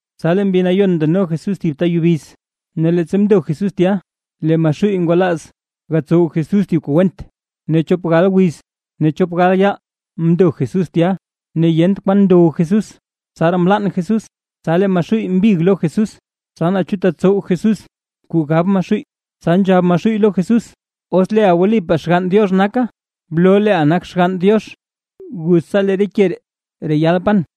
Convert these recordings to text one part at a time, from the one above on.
Tsa lee Mbi Nayon ndano Jesús thib ta yubiz, ne leettsa mndo Jesús tya, lee Maxuuy ngwalaaz gatsow Jesús kuu went. Ne chop gal wiz ne chop gal yaal mndo Jesús tya, ne yent kwaan ndow Jesús, tsaraa mlann Jesús. Tsa lee Maxuuy mbig lo Jesús, tsa naa chu tetsow Jesús kuu gab Maxuuy, tsa nzhab Maxuuy lo Jesús: ―Os leeʼa wlipaa Xgann Diox naka, bloo leeʼa nak Xgann Diox, guz tsa lee re ke ree reyal pan.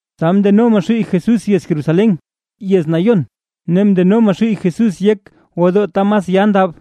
Tsa mndeno Maxuuy Jesús yez Jerusalén, yez nayon, ne mndeno Maxuuy Jesús yek gwodoo ta mas ya ndab,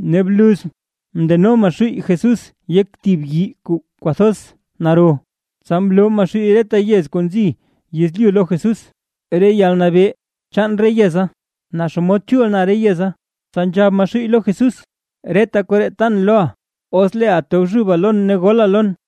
Ne bluz mndeno Maxuuy Jesús yek thib yii kuu kwathoz naro, tsa mloo Maxuuy reta yez kuu nzi lo yezlyu lo Jesús, re yalnabee chaan re yeza, naa xomod chul na re yeza. Tsa nzhab Maxuuy lo Jesús: ―Reta koree tan loʼa, os leeʼa tobxuba lon ne gola lon.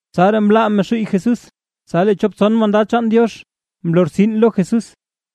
Tsaraa mlaa Maxuuy Jesús, tsa lee chop tson mandad chaan Diox mlortsin lo Jesús.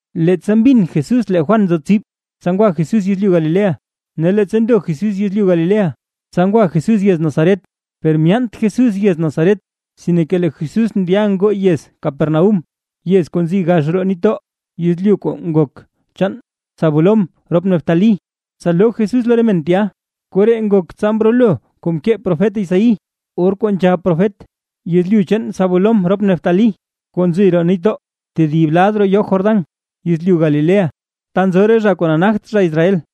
Leettsa mbin Jesús lee Juan nzo tsib, tsa ngwa Jesús yezlyu Galilea, ne leettsa ndo Jesús yezlyu Galilea, tsa ngwa Jesús yez Nazaret. Per myaant Jesús yez Nazaret, sinke lee Jesús ndya ngoo yez Capernaúm, yez kuu nzi gax roo nitdoo, yezlyu kuu ngok chaan Zabulón rop Neftalí, tsa loo Jesús lo re men tya. Koree ngok tsa mrolo kuu mkee profet Isaí, or kuu nzhab profet: Yezlyu chaan Zabulón rop Neftalí, kuu nzi roo nitdoo tedib lad roo yoo Jordán, yezlyu Galilea ta nzo re zha kuu nagt zha Israel.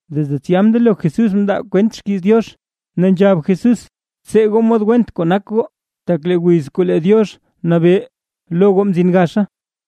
Desde tsya mndelo Jesús mndaa kwent xkiiz Diox, ne nzhab Jesús: ―Btsee goo mod went kuu nak goo, tak lee wiz kuu lee Diox nabee lo goo mzin gaxa.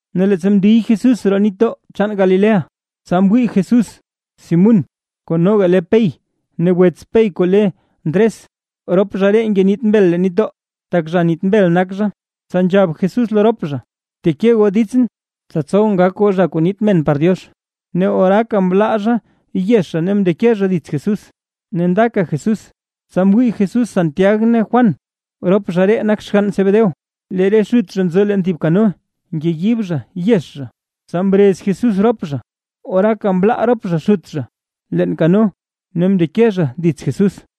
Ne leettsa ndiy Jesús roo nitdoo chaan Galilea, tsa mwii Jesús Simún kuu noga le Pey ne wets Pey kuu le Ndres, rop zha ree ngeniit mbel leen nitdoo, tak zha niit mbel nak zha. Tsa nzhab Jesús lo rop zha: ―Bteke goo ditsʼn, tsa tsowʼn gak goo zha kuu niit men par Diox. Ne oraaka mlaa zha yex zha ne mndeke zha dits Jesús. Ne ndaka Jesús, tsa mwii Jesús Santiag ne Juan, rop zha ree nak xgann Zebedeo, lee re xut zha nzo leen thib kano ngeyib zha yex zha, tsa mrez Jesús rop zha. Ne oraaka mlaa rop zha xut zha leen kano ne mndeke zha dits Jesús.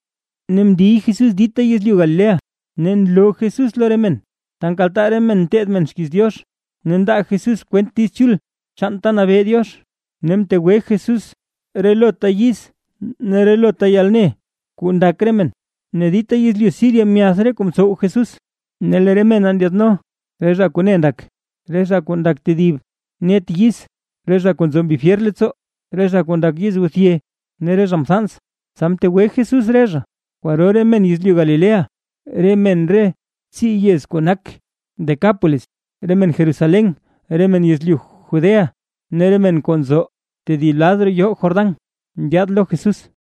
Ne mndiy Jesús dita yezlyu Galilea, ne nloo Jesús lo re men ta nkaltaa re men nteed xkiiz Diox. Ne ndaa Jesús kwent Diiz Chul chaan ta nabee Diox, ne mtegwe Jesús relota yiz ne relota yalne kuu ndak re men. Ne dita yezlyu Siria myath re kuu ntsow Jesús; ne lee re mena ndyaadno re zha kuu ne ndak, re zha kuu ndak tedib net re yiz, re zha kuu nzo mbi fyer leettsoo, re zha kuu ndak yizguthye ne re zha mthans, tsa mtegwe Jesús re zha. Kwaro re men yezlyu Galilea, re men re tsii yez kuu nak Decápolis, re men Jerusalén, re men yezlyu Judea ne re men kuu nzo tedib lad roo yoo Jordán ndyaad lo Jesús.